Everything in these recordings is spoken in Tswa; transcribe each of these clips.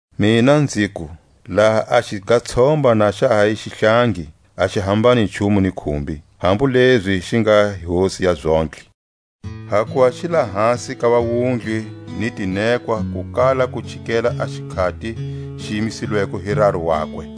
Mina nziku: Laha a xigatshomba na xa ha hi xihlangi a xi hambani nchumu ni khumbi, hambu lezi xi nga hosi ya zontlhe; hakuva xi lahasi ka vawundli ni tinekwa ku kala ku chikela a xikhati xi yimisilweko hi raru wakwe.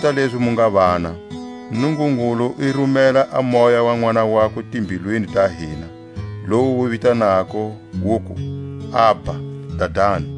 Kota lezi mu nga vana, Nungungulu i rumela a Moya wa Nʼwana wakwe timbilwini ta hina, lowu wu vitanako, wuku: Abba, Dadani!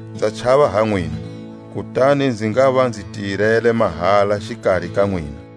Nza chava ha nwina, kutani nzi ngava nzi tirele mahala xikari ka nwina.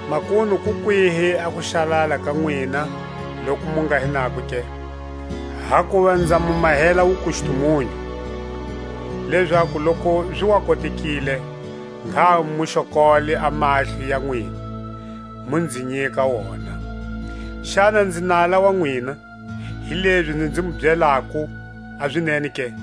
Makunu ku kwihi a kuxalala ka nwina loku mu nga hi nako ke? Hakuva nza mu mahela wukustumunyu, lezaku loku zi wa kotekile ngha mu xokole a mahlo ya nwina, mu nzi nyika wona. Xana nzi nala wa nwina, hilezi nzi mu byelako a zinene ke?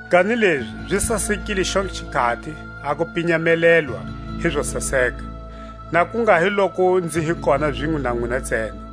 Kanilezi zi sasekile xontlhe xikhati a ku pinyamelelwa hi zo saseka, na ku nga hi loku nzi hi kona zinwe na nwina ntsena.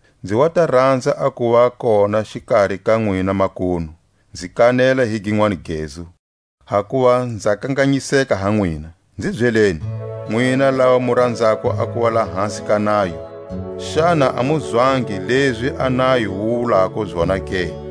nzi wa ta ranza a kuva kona xikari ka nwina makunu, nzi kanela hi ginwani gezu, hakuva nza kanganyiseka ha nwina. Nzi byeleni, nwina lava mu ranzako a kuva lahasi ka nayo, xana a mu zwangi lezi a nayo wu wulako zona ke?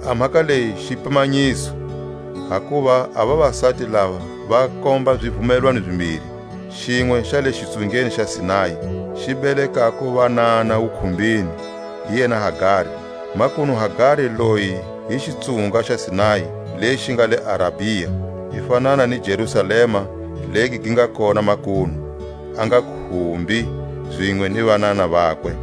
A mhaka leyi xipimanyiso, hakuva a vavasati lava va komba xivumelwano zimbiri; xinwe xa le xitsungeni xa Sinai, xi belekako vanana wukhumbini, hi yena Hagari. Makunu Hagari loyi hi xitsunga xa Sinai lexi xi nga le Arabia, i fanana ni Jerusalema legi gi nga kona makunu, a nga khumbi zinwe ni vanana vakwe.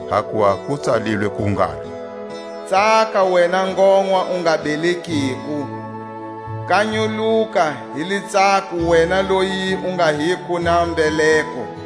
Hakuva ku tsalilwe ku ngalo: Tsaka wena ngonwa, u nga belekiko; Kanyuluka hi litsako wena loyi u nga hiko na mbeleko;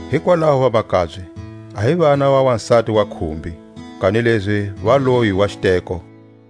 Hikwalaho vamakabye, a hi vana va wasati wa khumbi, kanilezi va loyi wa xiteko.